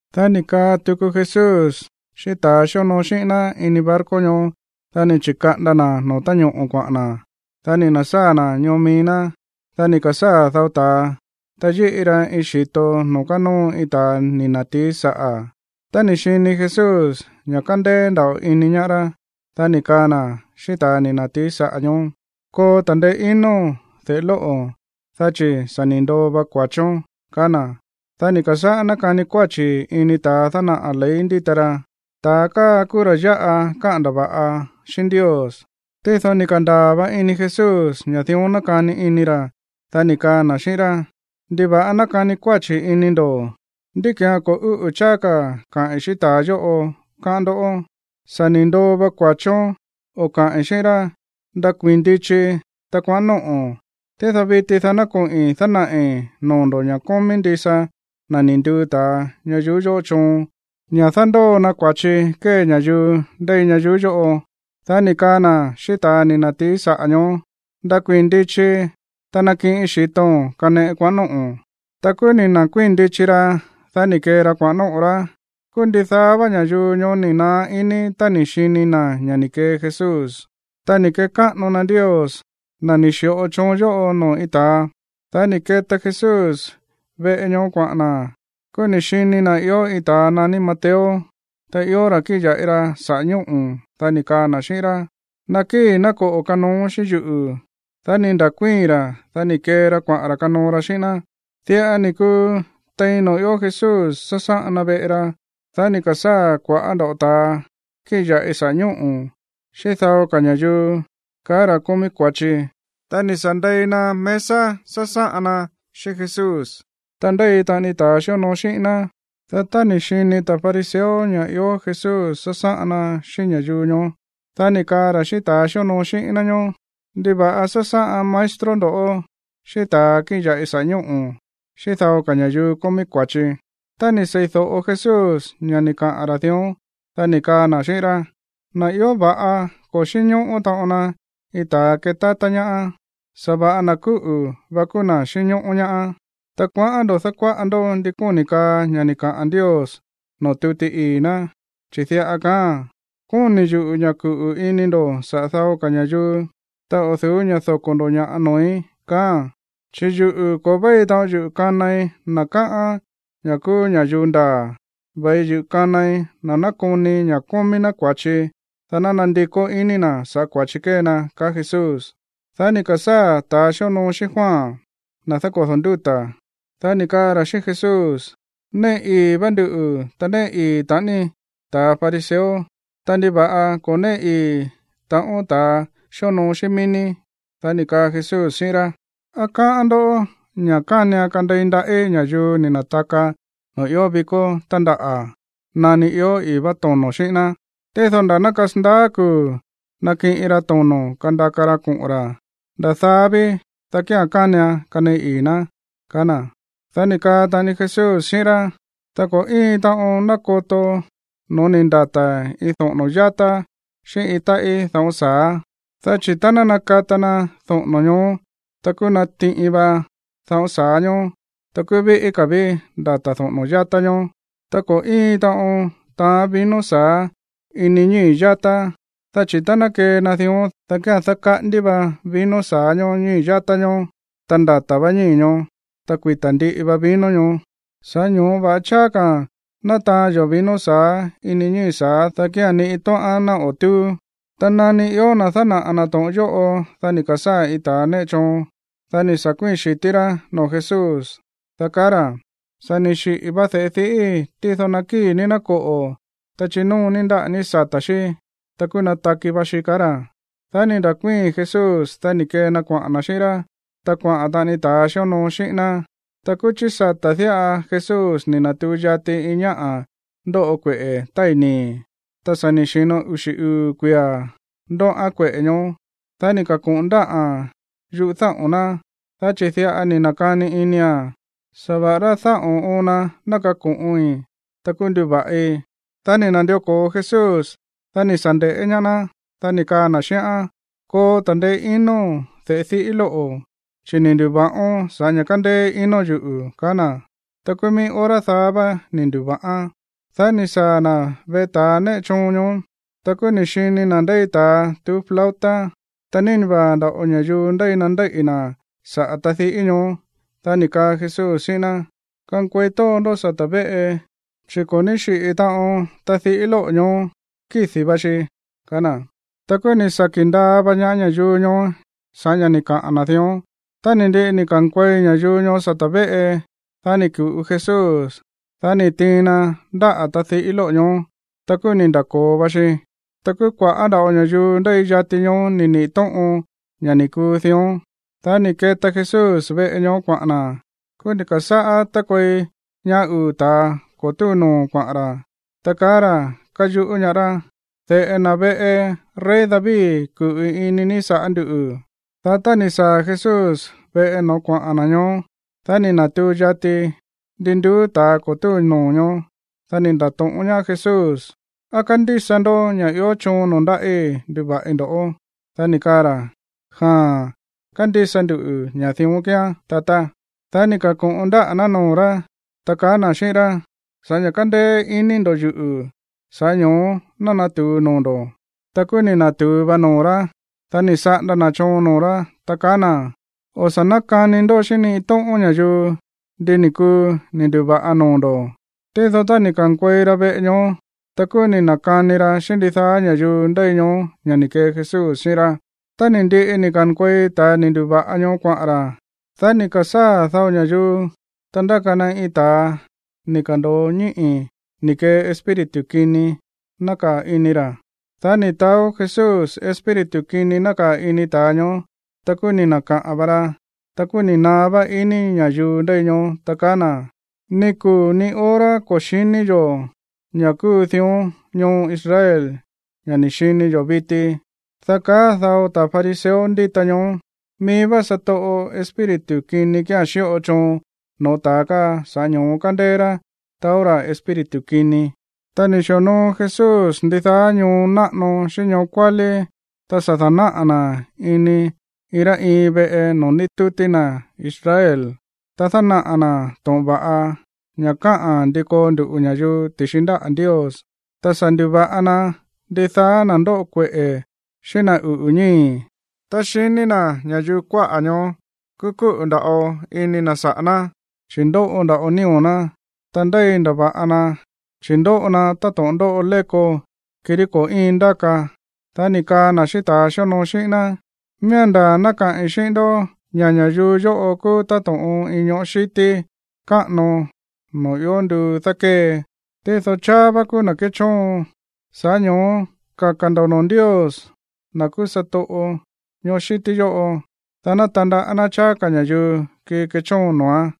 Dá ni̱ kaa tuku Jesús xíꞌín ta̱ xíonoo xíꞌín ná ini barco ñoó. Dá ni̱ chi̱kaꞌanda na̱ no̱ó ta̱ñoꞌo̱ kuaꞌa̱n na̱. Dá ni̱ na̱sáa̱ na̱ ñoo mií ná. Dá ni̱ ka̱sáa̱ dao ta̱a, ta yíꞌi ra iin xi̱to noo̱ kánóo iin ta̱a ni̱ na̱tií saꞌa̱. Tá ni̱ xini Jesús ña̱ kándéé nda̱ꞌo ini ñaá rá, dá ni̱ kaa na̱ xíꞌín ta̱a ni̱ na̱tií saꞌa̱ ñoó: ―Koo ta̱ndeé inóo̱n, de̱ꞌe lóꞌo̱, dá chi̱ sa̱ ni̱ ndoo va kua̱chón ―kaá na̱. Dá ni̱ ka̱sáꞌá nákani kuáchi̱ ini ta̱a dánaꞌa̱ ley ndíta ra: “Ta̱a káa kúú ra̱ yáꞌa káꞌa̱n ndava̱ꞌa xíꞌín Ndios.” Tído ni̱ ka̱ndaa̱ va ini Jesús ña̱ dión nákani ini ra̱. Dá ni̱ kaa na̱ xíꞌín rá: ―¿Ndiva̱ꞌa nákani kuáchi̱ ini ndo̱? ¿Ndí ki̱án ko̱ úꞌu̱ cháá ka̱ kaꞌi̱n xíꞌín ta̱a yóꞌo, káꞌán ndó? “Sa̱ ni̱ ndoo va kua̱chón”, o kaꞌi̱n xíꞌín rá, “Ndakuii̱n ndichi, ta kuaꞌa̱n nóꞌo̱n.” Tído viti dá ná koꞌi̱n dánaꞌi̱ noo̱ ndo̱ ña̱ kómí ndisa na̱ ni̱ nduu ta̱a ña̱yuu yóꞌo choon ña̱ dándóo na kua̱chi kée ña̱yuu ndéi ñayuú yóꞌo. Dá ni̱ kaa na̱ xíꞌín ta̱ ni̱ na̱tií saꞌa̱ ñoó: ―Ndakuii̱n ndichi, ta nakiꞌin xi̱to̱n kaneꞌe kuaꞌa̱n nóꞌo̱n. Ta kúú ni̱ nda̱kuíi̱n ndichi ra̱. Dá ni̱ kee ra kuaꞌa̱n nóꞌo̱ rá. Kúú ndidaá vá ña̱yuu ñoó ni̱ naá iní tá ni̱ xini na̱ ña̱ ni̱ kee Jesús, ta ni̱ kekáꞌano na Ndios, na̱ ni̱ xi̱ꞌo choon yóꞌo noo̱ iin ta̱a. Dá ni̱ keta Jesús veꞌe ñoó kuaꞌa̱n na̱. Kúú ni̱ xini na̱ ió iin ta̱a naní Mateo, ta ió ra̱ kíꞌin ya̱ꞌi ra saꞌa̱ ñóꞌo̱. Dá ni̱ kaa na̱ xíꞌín rá: ―Nakíi̱, ná koꞌo̱ kanooón xíꞌín yuꞌu̱. Dá ni̱ nda̱kuíi̱n ra̱, dá ni̱ kee ra kuaꞌa̱n ra̱ kanoo ra xíꞌín ná. Diꞌa ni̱ kuu tein noo̱ ió Jesús sásáꞌan na veꞌe ra, dá ni̱ ka̱sáa̱ kua̱ꞌá nda̱ꞌo ta̱a kíꞌin ya̱ꞌi saꞌa̱ ñóꞌo̱, xíꞌín dao ka̱ ña̱yuu kaá ra̱ kómí kua̱chi, ta ni̱ sa̱ ndei na mesa sásáꞌan na xíꞌín Jesús, ta ndéi taꞌani ta̱ xíonoo xíꞌín ná. Dá tá ni̱ xini ta̱ fariseo ña̱ ió Jesús sásáꞌan na xíꞌín ña̱yuu ñoó, dá ni̱ kaa ra̱ xíꞌín ta̱a xíonoo xíꞌín ná ñóó: ―¿Ndiva̱ꞌa sásáꞌan maestro ndo̱ xíꞌín ta̱a kíꞌin ya̱ꞌi saꞌa̱ ñóꞌo̱, xíꞌín dao ka̱ ña̱yuu kómí kua̱chi? Tá ni̱ sei̱do̱ꞌo Jesús ña̱ ni̱ kaꞌa̱n ra̱ dión, dá ni̱ kaa na̱ xíꞌín rá: ―Na̱ ió va̱ꞌa ko̱ xínñóꞌó taꞌon na iin ta̱a kétátá ñaá. Sa̱va̱ꞌa na̱ kúꞌu̱ va kúú na̱ xínñóꞌó ñaá. Ta kuaꞌán ndo̱ dákuáꞌa ndó ndi kóni̱ kaa ña̱ ni̱ kaꞌa̱n Ndios noo̱ tuti ii̱ ná, chi̱ diꞌa kaáa̱n: “Kóni̱ yuꞌu̱ ña̱ kuꞌu̱ ini ndo̱ saꞌa̱ dao ka̱ ña̱yuu, ta o̱ du̱ú ña̱ doko̱ ndo̱ ña̱ꞌa noo̱í”, kaáa̱n. Chi̱ yuꞌu̱, ko̱ véi taꞌon yuꞌu̱ kanai na̱ káꞌán ña̱ kúú ña̱yuu ndaa̱. Ve̱i yuꞌu̱ kanai na̱ nákoni ña̱ kómí ná kua̱chi, dá ná nandikó iní na̱ saꞌa̱ kua̱chi kée na ―kaá Jesús. Dá ni̱ ka̱sáa̱ ta̱ xíonoo xíꞌín Juan, na̱ dákodo̱ ndúta̱, dá ni̱ kaa ra̱ xíꞌín Jesús: ―Néꞌe ii̱ vá nduꞌu̱, ta néꞌe ii̱ taꞌani ta̱ fariseo. Ta, ¿ndiva̱ꞌa ko̱ néꞌe ii̱ taꞌon ta̱ xíonoo xíꞌín mií ní? Dá ni̱ kaa Jesús xíꞌín rá: ―¿Á káꞌán ndó ña̱ kánian kandei ndaꞌí ña̱yuu ni̱ na̱taka noo̱ ió vikó tándaꞌa̱ nani ió i̱í vá tono̱ xíꞌín ná? Tído nda̱ ná kasandaá kuu̱ nakiꞌin ra tono̱ kandaka ra koꞌo̱n ra̱, nda̱ daá ví, dá kía̱n kánian kaneꞌe ii̱ ná ―kaá na̱. Dá ni̱ kaa taꞌani Jesús xíꞌín rá: ―Ta ko̱ íin taꞌon nákoto no̱ó ni̱ ndata̱ iin doꞌo̱no̱ yátá xíꞌín iin táꞌí daꞌón sa̱á. Dá chi̱ tá ná nakata na doꞌo̱no̱ ñoó, ta kúú natiꞌin va daꞌón sa̱á ñóó, ta kúú víꞌí ka̱ ví ndata̱ doꞌo̱no̱ yátá ñóó. ’Ta ko̱ íin taꞌon taán vino sa̱á ini ñíi̱ yátá, dá chi̱ tá ná kee na dión, dá kía̱n dákaꞌándí va vino sa̱á ñoó ñií yátá ñóó, ta ndata̱ vá ñíi̱ ñoó, ta kuita̱ ndiꞌi va vino ñoó. Sa̱ꞌá ño̱ó va̱ꞌa cháá ka̱a̱n ná taán yo̱ vino sa̱á ini ñií sa̱á, dá kía̱n ni iin tóꞌán ná o̱ túú. Ta nani ió na̱ dánaꞌa̱ na̱ to̱ꞌon yóꞌo, dá ni̱ ka̱sáa̱ iin ta̱a néꞌe choon. Dá ni̱ sa̱ kuíi̱n xi̱tí rá noo̱ Jesús, dá kaá ra̱: ―Sa̱ ni̱ xiꞌi̱ va de̱ꞌe diꞌíi̱, tído nakíi̱ ní, ná koꞌo̱, ta chinóo ní ndáꞌa̱ ní sata̱ xí, ta kúú nataki va xi ―kaá ra̱. Dá ni̱ nda̱kuíi̱n Jesús, dá ni̱ kee na kuaꞌa̱n na̱ xíꞌín rá. Ta kuaꞌa̱n taꞌani ta̱ xíonoo xíꞌín ná. Ta kúú chí sata̱ diꞌa Jesús ni̱ na̱tuu yati iin ñáꞌa̱ ndóꞌo kueꞌe̱ tái̱ nii̱. Ta sa̱ ni̱ xi̱no uxi̱ uu̱ kuia̱ ndóꞌán kueꞌe̱ ñoó. Dá ni̱ ka̱ko̱ꞌon ndáꞌa̱n yúꞌu̱ dáꞌo̱n ná, dá chi̱ diꞌa ni̱ na̱kani inia̱n: “Sa̱va̱ꞌa rá dáꞌo̱n oon na ná kako̱ꞌin, ta kúú ná nduva̱ꞌi.” Dá ni̱ na̱ndió ko̱o Jesús, dá ni̱ sa̱ nde̱ꞌé ñaá ná, dá ni̱ kaa na̱ xíꞌán: ―Koo ta̱ndeé inóo̱n, de̱ꞌe diꞌí lóꞌo̱, chi̱ ni̱ ndu̱va̱ꞌón sa̱ꞌá ña̱ kándéé inóo̱n yuꞌu̱ ―kaá na̱. Ta kúú mií hora daá vá ni̱ ndu̱va̱ꞌán. Dá ni̱ saa̱ na̱ veꞌe ta̱ néꞌe choon ñoó. Ta kúú ni̱ xini na̱ ndéi ta̱a tuú flauta, ta nína vaa̱ nda̱ꞌo ña̱yuu ndéi na ndéíꞌi̱ na̱ saꞌa̱ tadiꞌí ñoó. Dá ni̱ kaa Jesús xíꞌín ná: ―Kankuei tóo ndó sata̱ véꞌe, chi̱ ko̱ ní xiꞌi̱ taꞌon tadiꞌí lóꞌo̱ ñoó, kídi̱ va xi ―kaá na̱. Ta kúú ni̱ saki̱ ndaa va ñaá ña̱yuu ñoó sa̱ꞌá ña̱ ni̱ kaꞌa̱n na̱ dión. Tá ni̱ ndiꞌi ni̱ ka̱nkuei ña̱yuu ñoó sata̱ véꞌe, dá ni̱ ku̱ꞌu Jesús. Dá ni̱ tiin na ndáꞌa̱ tadiꞌí lóꞌo̱ ñoó, ta kúú ni̱ nda̱ko̱o va xi. Ta kúú kua̱ꞌá nda̱ꞌo ña̱yuu ndéi yati ñoó ni̱ niꞌi̱ tóꞌon ña̱ ni̱ kuu dión. Dá ni̱ keta Jesús veꞌe ñoó kuaꞌa̱n na̱. Kúú ni̱ ka̱sáꞌá tákuei ñaá uu̱ ta̱a ko̱ túu noo̱ kuaꞌa̱n ra̱, ta kaá ra̱ káyuꞌú ñaá rá: ―¡De̱ꞌe na̱ veꞌe rey David, kuꞌu̱ ini ní sa̱ꞌá nduꞌu̱! Dá tá ni̱ saa̱ Jesús veꞌe no̱ó kuaꞌa̱n na̱ ñoó, dá ni̱ na̱tuu yati ndi nduú ta̱ ko̱ túu noo̱ ñoó. Dá ni̱ nda̱to̱ꞌón ñaá Jesús: ―¿Á kándísa ndó ña̱ ió choon noo̱ ndáꞌí nduva̱ꞌi ndo̱? Dá ni̱ kaa ra̱: ―Jaa̱n, kándísa ndu ña̱ dión kíán, tatá. Dá ni̱ ka̱ko̱ꞌon ndáꞌa̱ ná noo̱ rá, ta kaá na̱ xíꞌín rá: ―Sa̱ꞌá ña̱ kándéé iní ndo̱ yuꞌu̱, sa̱ꞌá ño̱ó ná natu̱u noo̱ ndo̱. Ta kúú ni̱ na̱tu̱u va noo̱ rá. Dá ni̱ saꞌanda na̱ choon noo̱ rá, ta kaá na̱: ―O̱ sa̱ nákani ndó xíꞌín ni iin tóꞌón ña̱yuu ndi ni̱ kuu ni̱ ndu̱va̱ꞌa noo̱ ndo̱. Tído tá ni̱ ka̱nkuei ra veꞌe ñoó, ta kúú ni̱ na̱kani ra xíꞌín ndidaá ña̱yuu ndéi ñoó ña̱ ni̱ kee Jesús xíꞌín rá. Tá ni̱ ndiꞌi ni̱ ka̱nkuei ta̱a ni̱ ndu̱va̱ꞌa ñoó kuaꞌa̱n ra̱, dá ni̱ ka̱sáa̱ dao ña̱yuu, ta ndáka na iin ta̱a ni̱ ka̱ndo̱o ñíꞌi̱ ni̱ kee espíritu kini nákaa̱ ini ra̱. Dá ni̱ taó Jesús espíritu kini nákaa̱ ini ta̱a ñoó, ta kúú ni̱ na̱kaꞌa̱n va ra. Ta kúú ni̱ naá vá iní ña̱yuu ndéi ñoó, ta kaá na̱: ―Ni kuu̱ ni hora ko̱ xi̱ní yo̱ ña̱ kúu dión ñoo Israel, ña̱ ni̱ xini yo̱ viti. Dá kaá dao ta̱ fariseo ndíta ñoó: ―Mií vá satoꞌo espíritu kini kía̱n xíꞌo choon noo̱ ta̱a káa, sa̱ꞌá ño̱ó kándéé rá taó ra̱ espíritu kini. Ta ni̱ xi̱onoo Jesús ndidaá ñoo náꞌano xíꞌín ñoo kuálí, ta sa̱ da̱náꞌa̱ na̱ ini iin rá iin veꞌe noo̱ ndítútí na̱ Israel. Ta dánaꞌa̱ na̱ to̱ꞌon va̱ꞌa, ña̱ káꞌa̱n ndi koo ndu̱ꞌu ña̱yuu ti̱xi ndáꞌa̱ Ndios. Ta sa̱ ndu̱va̱ꞌa na ndidaá na̱ ndóꞌo kueꞌe̱ xíꞌín na̱ uꞌu̱ ñíi̱. Tá xiní na̱ ña̱yuu kuáꞌa̱ ñoó, kúú kúꞌu̱ nda̱ꞌo ini na̱ saꞌa̱ ná, chi̱ ndóꞌo nda̱ꞌo nío̱ ná, ta ndéi ndava̱ꞌa na, chi̱ ndóꞌo na táto̱ꞌon ndóꞌo léko, kirí ko̱ íin ndáka. Dá ni̱ kaa na̱ xíꞌín ta̱a xíonoo xíꞌín ná: ―Miía̱n ndaa̱ ná kaꞌi̱n xíꞌín ndó ña̱ ña̱yuu yóꞌo kúú táto̱ꞌon iin ñoꞌó xíti káꞌano noo̱ sa̱ ió nduu dákée, tído cháá vá kúú na̱ kéchóon. Sa̱ꞌá ño̱ó kaka̱ ndo̱ noo̱ Ndios, na̱ kúú satoꞌo ñoꞌó xíti yóꞌo, dá ná tandaꞌá ná cháá ka̱ ña̱yuu kii kechóon noo̱án.